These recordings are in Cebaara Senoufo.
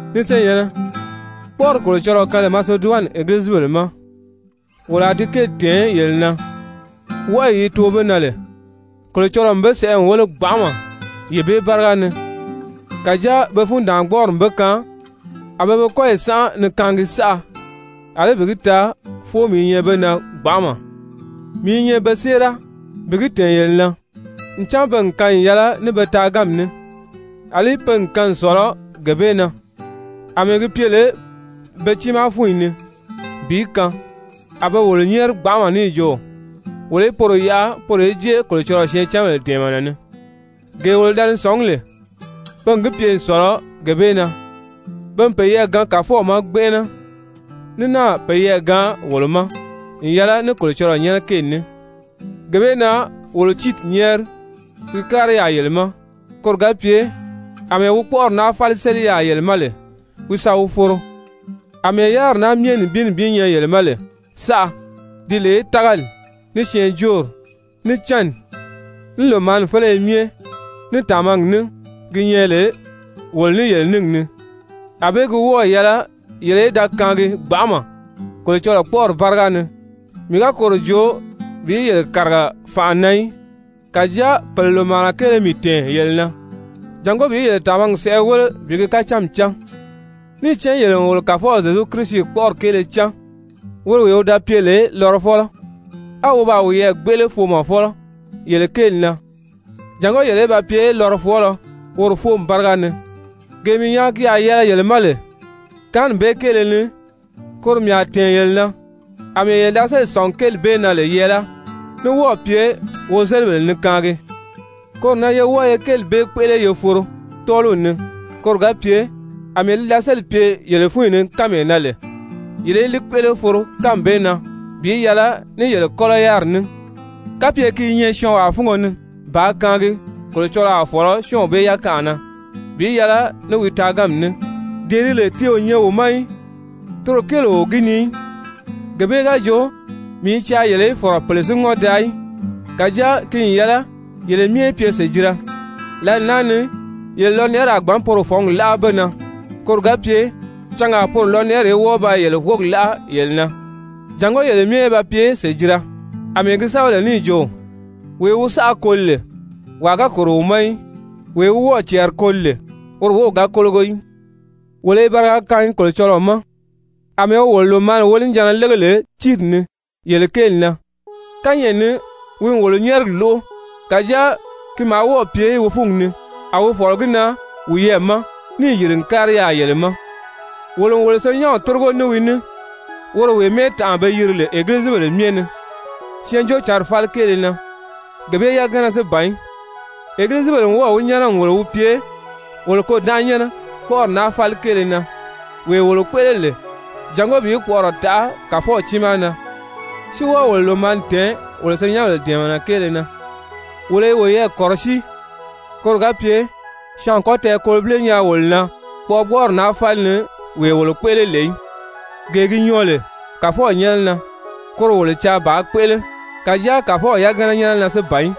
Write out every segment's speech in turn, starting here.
Ni senyɛ̀nnɛ, kpɔ́ʔɔri Kolocɔlɔɔ kaan lè Maseduwani egilizibèle ma, wolo a di kéeli tɛ̀ɛn yele na. Wɔʔɔyi yi too be na lè, Kolocɔlɔɔ n be sɛʔɛ n wéle gbanʔama yee bee báriga ni, kàjáa pe fundaangbɔɔri n be kaan a pe be kɔ́yi sánʔa ni kaangi saʔa, àlí bi gi taa fóomi i nyɛ be na gbanʔama. Mii i nyɛ be séera bi gi tɛ̀ɛn yele na, ncan pe n kaan n yɛlɛ ní be taaganmi ní, àlí pe n kaan n sɔ̀lɔ gee bee na, àmɛɛ gi pye lè be tiimaa fúnyi ni bi kaan, a be wolo nyɛ́ɛri gbanʔama níì jo wolo í poro yaʔa poro í jée Kolocɔlɔɔ syɛɛncanbèle dɛ̀ɛmɛnɛ ni. Gee wolo da ni sɔ̀ngí lè, pe n gi pye n sɔ̀lɔ gee bee na, pe n peyɛɛ gaan Kàfɔw ma gbɛnʔɛnɛ, ní náà peyɛɛ gaan wolo ma n yɛlɛ ní Kolocɔlɔɔ nyɛ́nɛ kéeli ní. Gee bee na wolo Tiiti nyɛ́ɛri wi kári yaà yele ma, koro ga pye àmɛɛ wi kpɔ́ʔɔri naa fáli séli yaà yele ma lè, wi sa wi foro. Amɛɛ yáriri naa myɛ nibin nibin nyɛ yele ma lè saʔa, di lè tágali, ní syɛɛnjóori, ní cánni, ní lòmaani féleye myɛ, ní tàmagi ní gi nyɛ lè wolo ní yele níngi ni, ànbée gi wɔ́ɔ̀ yɛlɛ yele í da kaangi gbanʔama Kolocɔlɔɔ kpɔ́ʔɔri báriga ni. Mii ga koro joo bi yele kàriga fànʔa na í, kàjáa pèle lòmaana kéele mii tɛ̀ɛn yele na, jàngó bi yele tàmagi sɛʔɛ wéle bi gi kacánmi cán. Níì cán yele n wolo Kàfɔw Zyezu Kirisi kpɔ́ʔɔri kéele cán, woro wee wi da pye lè lɔrɔfɔlɔ, á wi baa wiyɛɛ gbéʔele foomɔfɔlɔ yele kéeli na, jàngó yele í ba pye lɔrɔfɔɔlɔ woro fóomi báriga ni. Gee mii nyaa ki a yɛlɛ yele ma lè kaanni bee kéele ni, koro mii a tɛ̀ɛn yele na, àmɛɛ yele da sélì sɔ̀ngi kéeli bee na lè yɛɛláa, ní wɔ́ɔ̀ pye wozelibèle ni kaangi, koro na ye wɔ́ɔ ye kéeli bee kpéʔele ye foro tɔ́ɔliw ni koro ga pye àmɛɛ li da sélì pye yele fúnyi ni kánmee na lè, yele í li kpéʔele foro kánmi bee na bi yɛlɛ ní yele kɔ́lɔ yáriri ní. Kapye ki i nyɛ syɔɔnwaa fúngo ni bàā kaangi, Kolocɔlɔɔ a fɔ̀lɔ syɔ́ɔnw bee yakanʔa na bi yɛlɛ ní wi taaganmi ní, dee di lè ti o nyɛ wi ma í, toro kéele o gi ni í. Gee bee ga jo mii i caa yele í fɔ̀rɔ pèle si ŋɔ́n daa í, kàjáa ki n yɛlɛ yele myɛ í pye sèjira. Lǎli naa ni yele lɔnɛʔɛri a gbǎn poro fɔ̌ngi láʔa be na, koro ga pye cangaa poro lɔnɛʔɛri í wɔ́ɔ ba yele wógi láʔa yele na, jàngó yele myɛ í ba pye sèjira. Amɛɛ gi sɛ́bɛ lè n jo: «Wee wi saʔa koli lè, wàa ga kòro wi ma í, wee wi wɔ́ɔ̀ cɛɛri koli lè, woro wów ga kólogo í.» Wolo i bariga kaangi Kolocɔlɔɔ ma àmɛɛ wi wolo lòmaani wonijanna lége lè Tiiti ni yele kéeli na. Kányɛʔɛ ni wi n wolo nyɛ́ɛrigi lóʔo, kàjáa ki maa wɔ́ɔ̀ pye wi fúngi ni, a wi fɔ̀lɔ gi na wiyɛɛ ma níì yìri n kári yaà yele ma. Wolo n wo senyɛnw tórigo ní wi ní woro wee mɛ́ɛtanʔa be yiri lè egilizibèle myɛ ni Syɛɛnjóocǎnri fáli kéele na. Gee bee yagana si ban í, egilizibèle n wɔ́ɔ̀ wi nyɛ́nɛ n wòlo wi pye wolo kôdánʔanyɛnnɛ kpɔ́ʔɔri naa fáli kéele na, wee wolo kpéʔele lè jàngó bi kpɔʔɔrɔ taʔa Kàfɔw tiimaa na, si wɔ́ɔ wolo lòmaani tɛ̀ɛn wolo senyɛnbèle dɛ̀ɛmɛnɛ kéele na. Wolo i woyɛɛ kɔ̀rɔsíi koro ga pye syɔɔn a kɔ́ tɛɛkolobile nyaa wolo na kpɔʔɔgbɔɔri naa fáli ni wee wolo kpéʔele lè í. Gee gi nyɔɔ lè Kàfɔw nyɛ́nɛ na, koro wolo caa bàā kpéʔele, kàjáa Kàfɔw yagana nyɛ́nɛ na si ban í,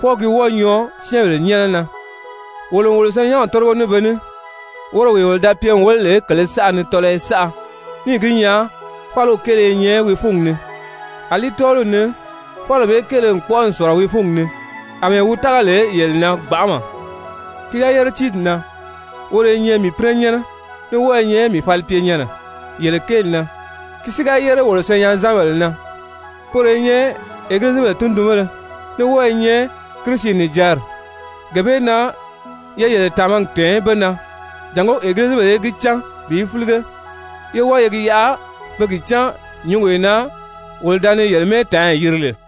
fwɔɔ ki wɔ́ɔ nyɔɔ syɛ́ɛnbèle nyɛ́nɛ na. Wolo n wolo senyɛnw tórigo ní be ní, woro wee wolo da pye n wéle lè kèlē saʔa ni tɔlɔyɔ saʔa, níì gi nyaa fáliw kéele i nyɛ wi fúngi ni, àlí tɔ́ɔliw ni fáliw bee kéele n kpɔ́ʔɔ n sɔ̀lɔ wi fúngi ni àmɛɛ wi tága lè yele na gbanʔama. Ki ga yére Tiiti na, woro i nyɛ mii pínɛnyɛnnɛ, ní wɔ́ɔ i nyɛ mii falipyenyɛnnɛ yele kéeli na. Ki si ga yére wolo senyɛnzanbèle na, poro i nyɛ egilizibèle tundunbéle, ní wɔ́ɔ i nyɛ Kirisi nìjanri. Gee bee na ye yele tàmagi tɛ̀ɛn be na jàngó egilizibèle í gi cán bi fílige, yé wɔ́ɔ ye gi yaʔa be gi cán nyǔngee na wolo da ni yele mɛ́ɛtaanyi yiri lè.